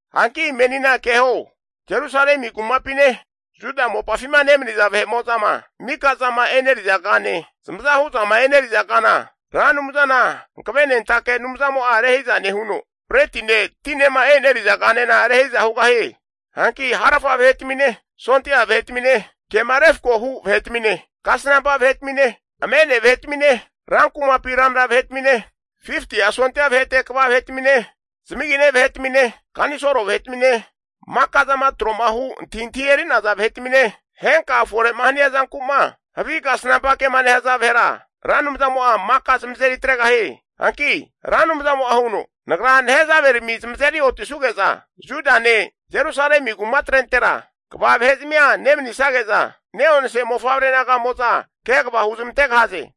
Hanki menina keho, Jerusalemi kumapine Juda mopafima nemaniza vahe'mo'zama mika'zama eneriza kane, zamaza hu'zama eneriza kana, Ra Anumzana Hankavenentake Anumzamo'a rehiza nehuno, bretine tinema eneriza kanena rehiza hugahie. Hanki harafa vahe'tamine, sondia vahetamine, kema refko hu' vahetamine, kasnampa vahetamine, amene vahetamine, rankumapi ranra vahetamine, 50'a sondia vahete kva vahe'tamine, zamagine vahetamine, kanisolo vahetamine, maka'zama tro'ma hu antahintahi eri'naza vahetamine, henka fore'ma hania zanku'ma havi kasnampa ke'ma nehaza vahera Ra Anumzamo'a maka zamazeri atregahie. Hanki Ra Anumzamo'a huno, Nagra nehazaverami zamazeri otisuge'za Judane Jerusalemi kumatrentera kva vahe'zamia nemanisage'za, ne'onse mofavre naga'mo'za kegava huzmantegahaze.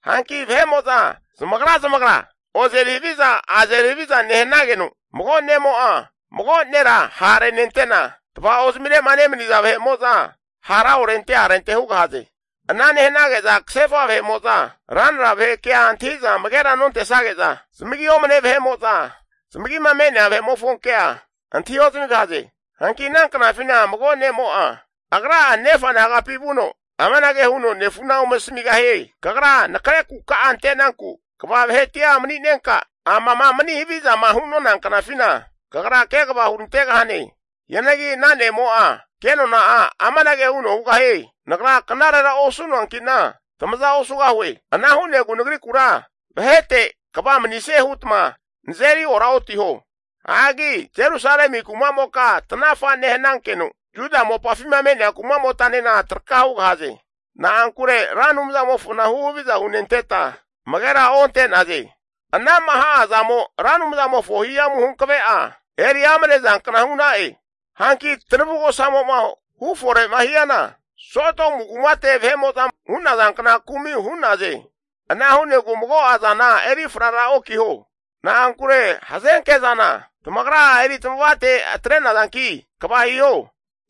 Hanki vahe'mo'za zamagra zamagra ozeri haviza azeri haviza nehanageno, mago ne'mo'a mago nera ha'renente'na, tava'ozmire'ma nemaniza vahe'mo'za hara orente arente hugahaze. Ana nehanage'za kasefa vahe'mo'za ranra vahe kea antahi'za amagera nontesage'za, zamagi omne vahe'mo'za zamagima me'nea vahe'mofo kea antahi ozamigahaze. Hanki ana knafina mago ne'mo'a agra'a nefa nagapi vuno amanage huno nefuna ome asamigahie, Kagra nakre kuka'a ante'nanku kva vahetia mani'nenka, amama mani havizama hu'nona knafina, kagra kegava hurantegahane. Hianagi ana ne'mo'a kenona'a amanage huno hugahie, Nagra knarera osu'noankina tamaza osugahue. Ana hu'negu nagrikura vahete kva manisanie hutma nazeri oraotiho! Hagi Jerusalemi kumamoka tanafa nehanankeno, Juda mopafima me'nea kuma'motanena traka hugahaze. Na'ankure Ra Anumzamofona huhaviza henenteta amagera onte'naze. Ana'ma ha'azamo Ra Anumzamofo hihamu hankave'a eri amnezankna hu'na'e. Hanki tanavugosamo'ma hufore'ma hiana, Sodomu kumate vahe'mo'zama hu'nazankna kumi hu'naze. Ana hu'negu mago'a zana eri frara okiho. Na'ankure hazenke zana tamagra'a eri tamavate atre'nazanki kva hiho.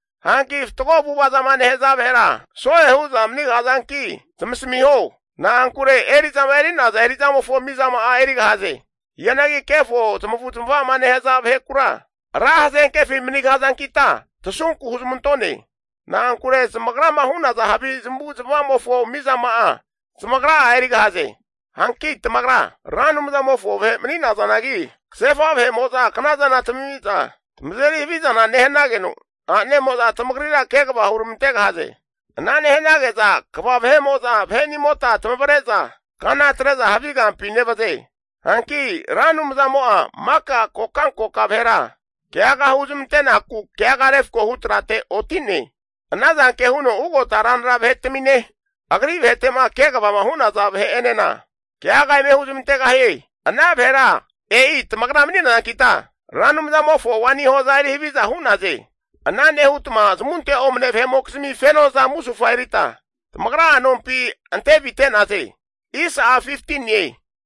Hanki fatgo avu'avazama nehaza vahera so'e hu'za manigahazanki zamasamiho. Na'ankure eri'zama eri'naza eri'zamofo mizama'a erigahaze. Hianagi kefo zamavu zamava'ma nehaza vahekura, ra hazenkefi manigahazankita tasunku huzmantone. Na'ankure zamagrama hu'naza havi zamavu zamavamofo mizama'a zamagra'a erigahaze. Hanki tamagra Ra Anumzamofo vahe mani'nazanagi, kasefa vahe'mo'za knazana tamamiza tamazeri havizana nehanageno, a'nemo'za tamagrira kegava huramante'naze. Ana nehanage'za kva vahe'mo'za vahenimota tamavre'za kana atre'za havi kampi nevaze. Hanki Ra Anumzamo'a maka kokankoka vahera keaga huzmante'naku keaga refko hu trate oti'ne. Ana zanke huno ugota ranra vahetamine, Agri vahetema kvama hu'naza vahe'enena keaga eme huzmantegahie. Ana vahera e'i tamagra mani'nazankita, Ra Anumzamofo waini hoza eri haviza hu'naze. Ana nehutma zamunte omne vahe'mokizmi fenoza musufa erita, tamagra'a nompi ante avite'naze.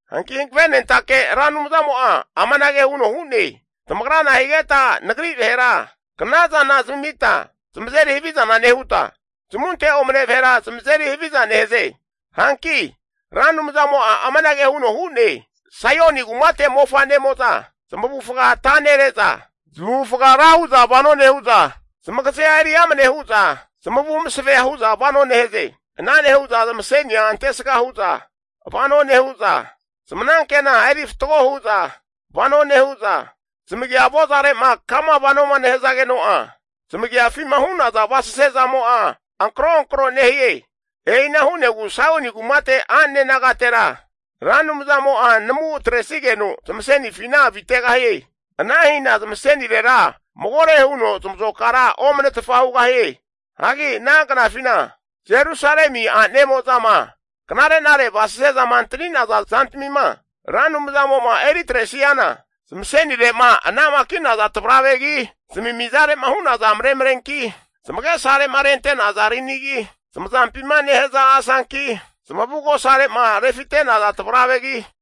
Hanki hankavenentake Ra Anumzamo'a amanage huno hu'ne, Tamagra nahigeta Nagri vahera knazana zamita zamazeri havizana nehuta, zamunte omne vahera zamazeri haviza nehaze? Hanki Ra Anumzamo'a amanage huno hu'ne, Saioni kumate mofanemo'za zamavufaga ata nere'za, zamavufaga ra huza vano nehu'za, zamagazea eri amne hu'za zamavu masavea hu'za vano nehaze. Ana nehu'za zamasenia antesga hu'za vano nehu'za, zamanankena eri fatgo hu'za vano nehu'za, zamagia avozare'ma kama vanoma nehazageno'a, zamagiafima hu'naza avasese zamo'a ankro ankro nehie. E'ina hu'negu Saioni kumate a'nane nagatera, Ra Anumzamo'a namu atresanigeno zamasenifina avitegahie. Ana hina zamasenirera magore huno zamazokara omnetfa hugahie. Hagi ana knafina Jerusalemi a'nemo'zama knare'nare avasese zama antaninaza zantamima Ra Anumzamo'ma eri atresiana, zamasenire'ma anamaki'naza tvaravegi, zamimizare'ma hu'naza maremarenki, zamagesare'ma renentaza rinigi, zamazampima nehaza asanki, zamavugosare'ma refinetaza tvaravegi,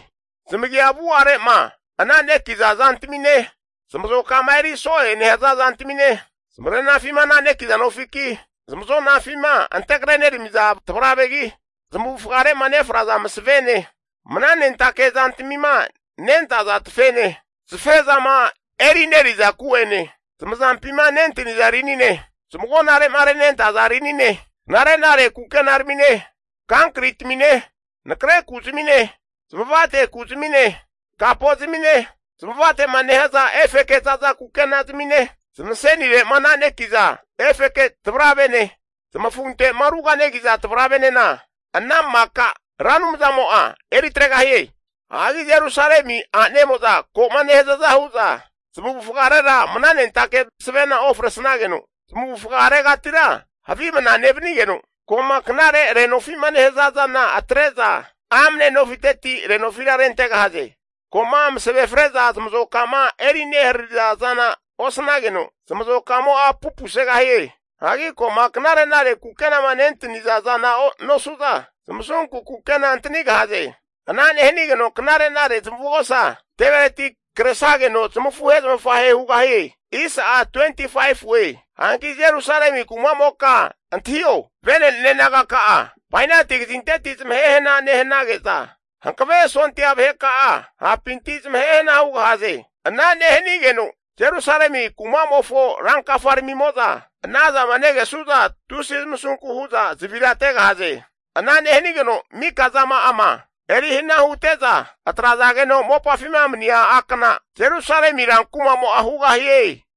zamagia avu'are'ma ananekiza zantamine, zamazoka'ma eri so'e nehaza zantamine, zamare'nafima ananekiza nofiki, zamazonafima ante kareneramiza tavravegi, zamavufagare'ma nefraza masavene, mananentake zantamima nentaza tafene, safezama erineri'za ku'ene, zamazampima nentaniza rinine, zamagonare'ma renentaza rinine, knare nare kukenaramine, kankri tamine, nakre ku'zamine, zamavate kuzmine, kapozamine, zamavate'ma nehaza efeke za'za kukenazamine, zamasenire'ma ananekiza efeke tavravene, zamafunte'ma ruganegiza tavravenena, ana maka Ra Anumzamo'a eri atregahie. Hagi Jerusalemi a'nemo'za ko'ma nehazaza hu'za zamavufagarera mnanentake masavena ofresageno, zamavufagaretira havi mna nevanigeno, ko'ma knare renofi'ma nehaza zana atre'za, amne nofiteti renofira rentegahaze. Ko'ma masave fre'za zamazoka'ma eri neharariza zana osnageno, zamazokamo'a pupusegahie. Hagi ko'ma knare'nare kukenama nentaniza zana nosu'za, zamasunku kukena antanigahaze. Ana nehanigeno knare'nare zamavugosa tevereti kresageno zamafuhe zamafahe hugahie. Hanki Jerusalemi kumamoka antahio, vene'ne nagaka'a bainati kazinteti zamahe hana nehanage'za, hankave sondia vaheka'a hapinti zamahe hana hugahaze. Ana nehanigeno Jerusalemi kumamofo ran kafaramimo'za anazama negesu'za, tusi zamasunku hu'za zavirategahaze. Ana nehanigeno mika zama'ama eri hana hute'za atrazageno mopafima mania akana Jerusalemi ran kumamo'a hugahie.